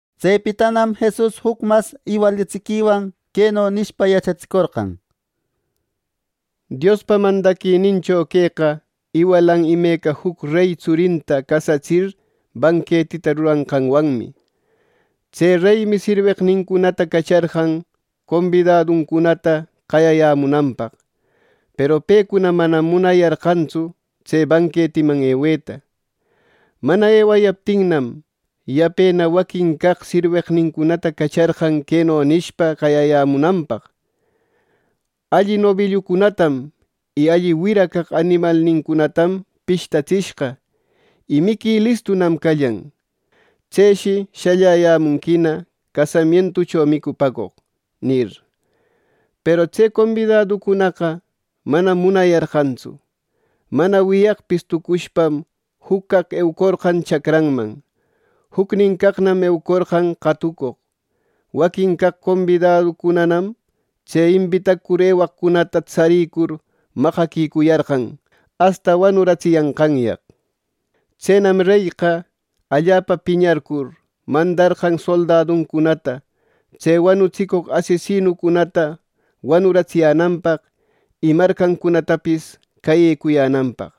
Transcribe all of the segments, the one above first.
Tsepitanam Jesus juc mas iwalatsiquiwan queno nishpa yachatsicorqan: “Diospa mandaquinincho queqa iwalan imeca juc rey tsurinta casatsir banquetita ruranqanwanmi. Tse reymi sirweqnincunata cacharqan combidaduncunata qayayämunanpaq. Peru pecuna manam munayarqantsu tse banquetiman eweta. Mana ewayaptinnam, yapena waquin caq sirweqnincunatana cacharqan queno nishpa qayayämunanpaq: ‘Alli nobillucunatam y alli wira caq animalnincunatam pishtatishqa y miqui listunam callan. Tseshi shalläyämunquina casamientucho micupäcoq’ nir. Peru tse combidaducunaqa manam munayarqantsu. Mana wiyaqpis tucushpam juc caq eucorqan chacranman; jucnin caqnam eucorqan qatucoq. Waquin caq combidaducunanam tse imbitacur ewaqcunata tsaricur, maqaquicuyarqan asta wanuratsiyänqanyaq. Tsenam reyqa allapa piñarcur, mandarqan soldaduncunata tse wanutsicoq asesinucunata wanuratsiyänanpaq, y marcancunatapis cayecuyänanpaq.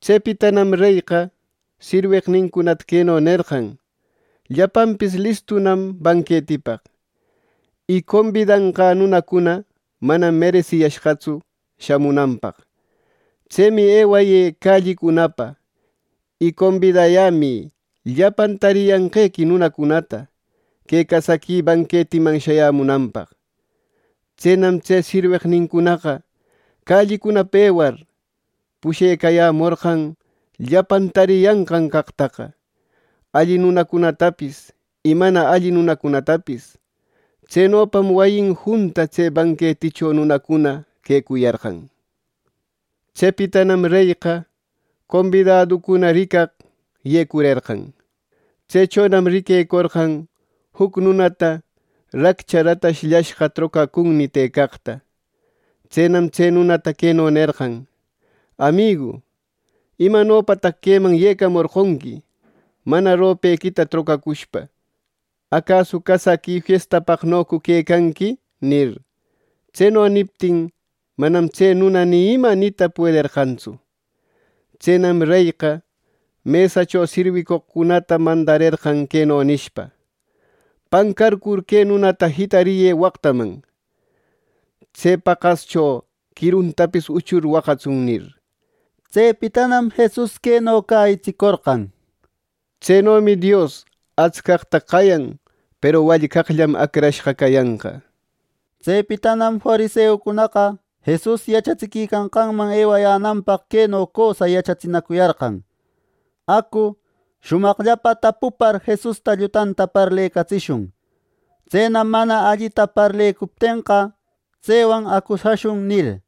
Tsepitanam reyqa sirweqnincunata queno nerqan: ‘Llapanpis listunam banquetipaq; y combidanqä nunacuna manam meresiyashqapistsu shamunanpaq. Tsemi ewayë callicunapa y combidayämï llapan tariyanqequi nunacunata que casaqui banquetiman shayämunanpaq.’ Tsenam tse sirweqnincunaqa callicunapa ewar, pushecayämorqan llapan tariyanqan caqtaqa, alli nunacunatapis y mana alli nunacunatapis. Tsenopam wayin junta tse banqueticho nunacuna quecuyarqan. “Tsepitanam reyqa combidaducuna ricaq yecurerqan. Tsechonam riquecorqan juc nunata raccha ratashllashqa trocacüni tëcaqta. Tsenam tse nunata queno nerqan: ‘Amigu, ¿imanopataq queman yecamorqonqui mana ropequita trocacushpa! ¿Acasu casaqui fiestapaqnocu quecanqui!’ nir. Tseno niptin manam tse nuna ni ima nita puederqantsu. Tsenam reyqa mesacho sirwicoqcunata mandarerqan queno nishpa: ‘Pancarcur, que nunata jitariyë waqtaman. Tse paqascho quiruntapis uchur waqatsun’” nir. Tsepitanam Jesus queno cäyitsicorqan: —Tsenomi Dios atscaqta qayan. Peru wallcaqllam acrashqa cayanqa. Tsepitanam fariseucunaqa Jesus yachatsiquicanqanman ewayänanpaq queno cösa yachatsinacuyarqan: —Acu, shumaqllapa tapupar Jesusta llutanta parlecatsishun. Tsenam mana allita parlecuptenqa, tsewan acusashun —nir.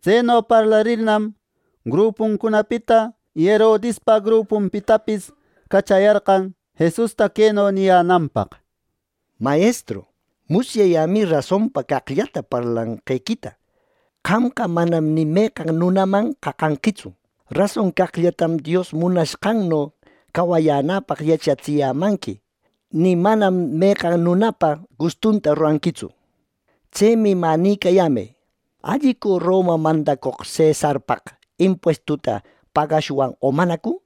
Tseno parlarirnam, grupuncunapita y Herodispa grupunpitapis cachayarqan Jesusta queno niyänanpaq: —Mayestru, musyayämi rasonpa caqllata parlanqequita. Qamqa manam ni meqan nunaman qaqanquitsu. Rason caqllatam Dios munashqanno cawayänäpaq yachatsiyämanqui; ni manam meqan nunapa gustunta ruranquitsu. Tsemi mä nïcayämë, ¿Allicu Roma mandacoq cesarpaq impuestuta pagashwan o manacu? —nir.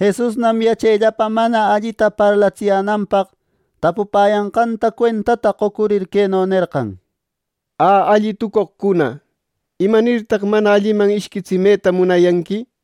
Jesusnam yachellapa mana allita parlatsiyänanpaq tapupäyanqanta cuentata qocurir queno nerqan: —Ä, alli tucoqcuna, ¿Imanirtaq mana alliman ishquitsimeta munayanqui!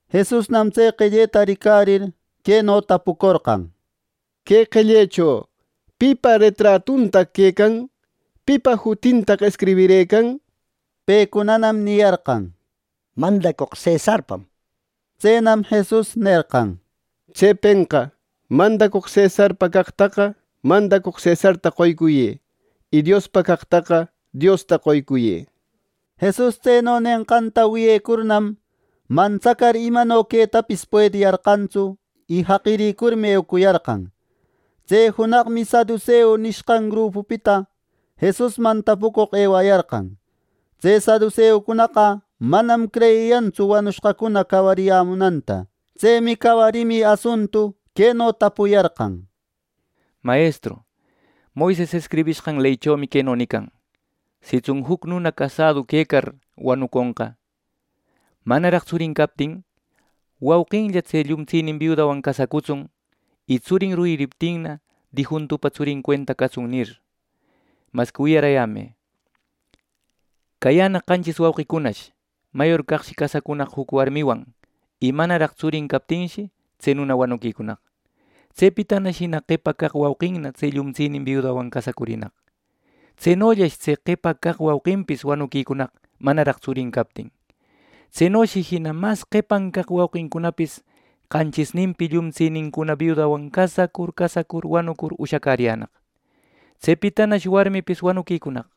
Jesusnam tse qelleta ricarir, queno tapucorqan: —Que qellecho ¿pipa retratuntaq quecan? ¿Pipa jutintaq escribirëcan? —nir. Pecunanam niyarqan: —Mandacoq cesarpam —nir. Tsenam Jesus nerqan: —Tsepenqa mandacoq cesarpa caqtaqa mandacoq cesarta qoycuyë; y Diospa caqtaqa Diosta qoycuyë —nir. Jesus tseno nenqanta wiyecurnam, mantsacar imano quetapis puediyarqantsu y jaqirïcurmi eucuyarqan. Tse junaqmi saduseu nishqan grupupita Jesusman tapucoq ewayarqan. Tse saduseucunaqa manam creyiyantsu wanushqacuna cawariyämunanta. Tsemi cawarimi asuntu queno tapuyarqan: —Mayestru, Moises escribishqan leychomi queno nican: ‘Sitsun juc nuna casadu quecar wanuconqa manaraq tsurin captin, wauqinlla tse llumtsinin biudanwan casacutsun; y tsurin yuririptinna, difuntupa tsurin cuenta catsun’ nir. Masqui wiyarämë: Cayänaq qanchis wauqicunash. Mayor caqshi casacorqan juc warmiwan y manaraq tsurin captinshi, tse nuna wanuquicunaq. Tsepitanash jina qepa caq wauqinna tse llumtsinin biudawan casacurinaq. Tsenollash tse qepa caq wauqinpis wanuquicunaq manaraq tsurin captin. Tsenoshi jina mas qepan caq wauqincunapis qanchisninpi llumtsinincuna biudawan casacur casacur wanur ushacäriyänaq. Tsepitanash warmipis wanuquicunaq.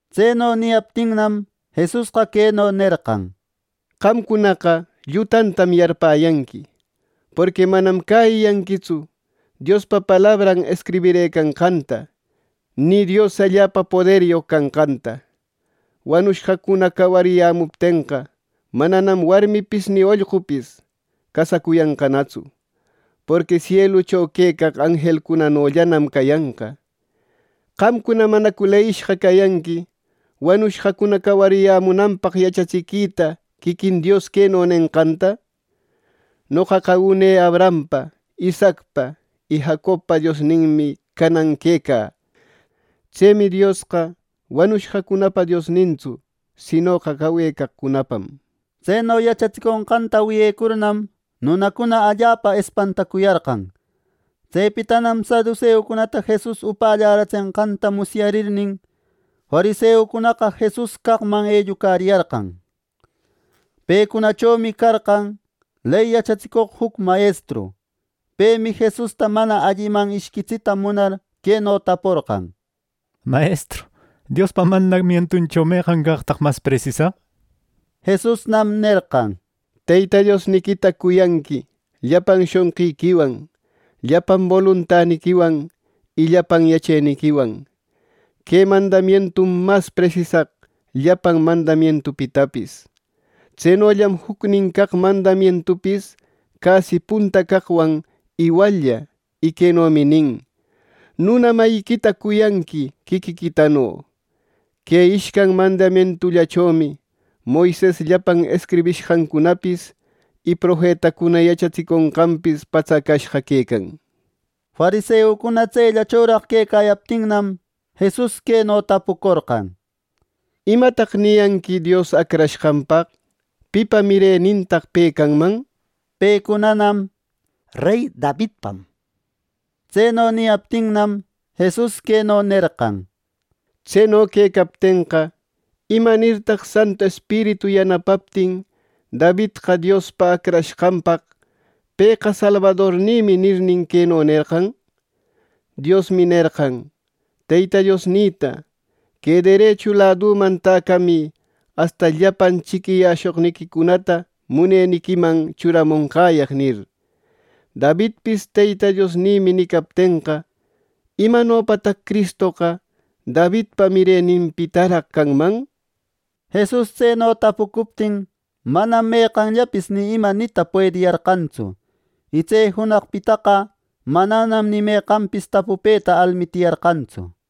Tseno niyaptinnam, Jesusqa queno nerqan: —¡Qamcunaqa llutantam yarpäyanqui, porqui manam cäyiyanquitsu Diospa palabran escribirëcanqanta, ni Dios allapa poderyoq canqanta! Wanushqacuna cawariyämuptenqa, mananam warmipis ni ollqupis casacuyanqanatsu. Porqui sielucho quecaq anjelcunanollanam cayanqa. Qamcuna ¿manacu leyishqa cayanqui wanushqacuna cawarimunanpaq yachatsiquita quiquin Dios queno nenqanta! ‘Noqaqa une Abrahampa, Isaacpa y Jacobpa Diosninmi canan quecä. Tsemi Diosqa wanushqacunapa Diosnintsu; sinoqa cawecaqcunapam’ nir. Tseno yachatsiconqanta wiyecurnam, nunacuna allapa espantacuyarqan. Tsepitanam saduseucunata Jesus upalläratsenqanta musyarirnin, fariseucunaqa Jesus caqman ellucariyarqan. Pecunachomi carqan ley yachatsicoq juc mayestru. Pemi Jesusta mana alliman ishquitsita munar queno taporqan: —Mayestru, Diospa mandamientucho ¿Meqan caqtaq mas presisaq? —nir. Jesusnam nerqan: —‘Teyta Diosniquita cuyanqui llapan shonqiquiwan, llapan boluntaniquiwan y llapan yacheniquiwan.’ Que mandamientum mas presisaq llapan mandamientupitapis. Tsenollam jucnin caq mandamientupis casi punta caqwan iwallla y quenomi nin: ‘Nuna mayiquita cuyanqui quiquiquitano.’ Que ishcan mandamientullachomi Moises llapan escribishqancunapis y profetacuna yachatsiconqanpis patsacashqa quecan —nir. Fariseucuna tsellachoraq quecayaptinnam, Jesus queno tapucorqan: —¿Imataq niyanqui Dios Acrashqanpaq? ¿Pipa mirenintaq pe canman? —nir. Pecunanam “Rey Davidpam” niyarqan. Tseno niyaptinnam, Jesus queno nerqan: —Tseno quecaptenqa, ¿Imanirtaq Santu Espiritu yanapaptin Davidqa Diospa Acrashqanpaq ‘Pëqa salbadornïmi’ nirnin, queno nerqan? ‘Diosmi nerqan Teyta Diosnïta: Que derechu ladüman täcamï asta llapan chiquiyäshoqniquicunata muneniquiman churamonqäyaq’ nir. Davidpis ‘Teyta Diosnïmi’ nicaptenqa, ¿Imanopataq Cristoqa Davidpa mireninpitaraq canman! —nir. Jesus tseno tapucuptin, manam meqanllapis ni ima nita puediyarqantsu. Y tse junaqpitaqa mananam ni meqanpis tapupeta almitiyarqantsu.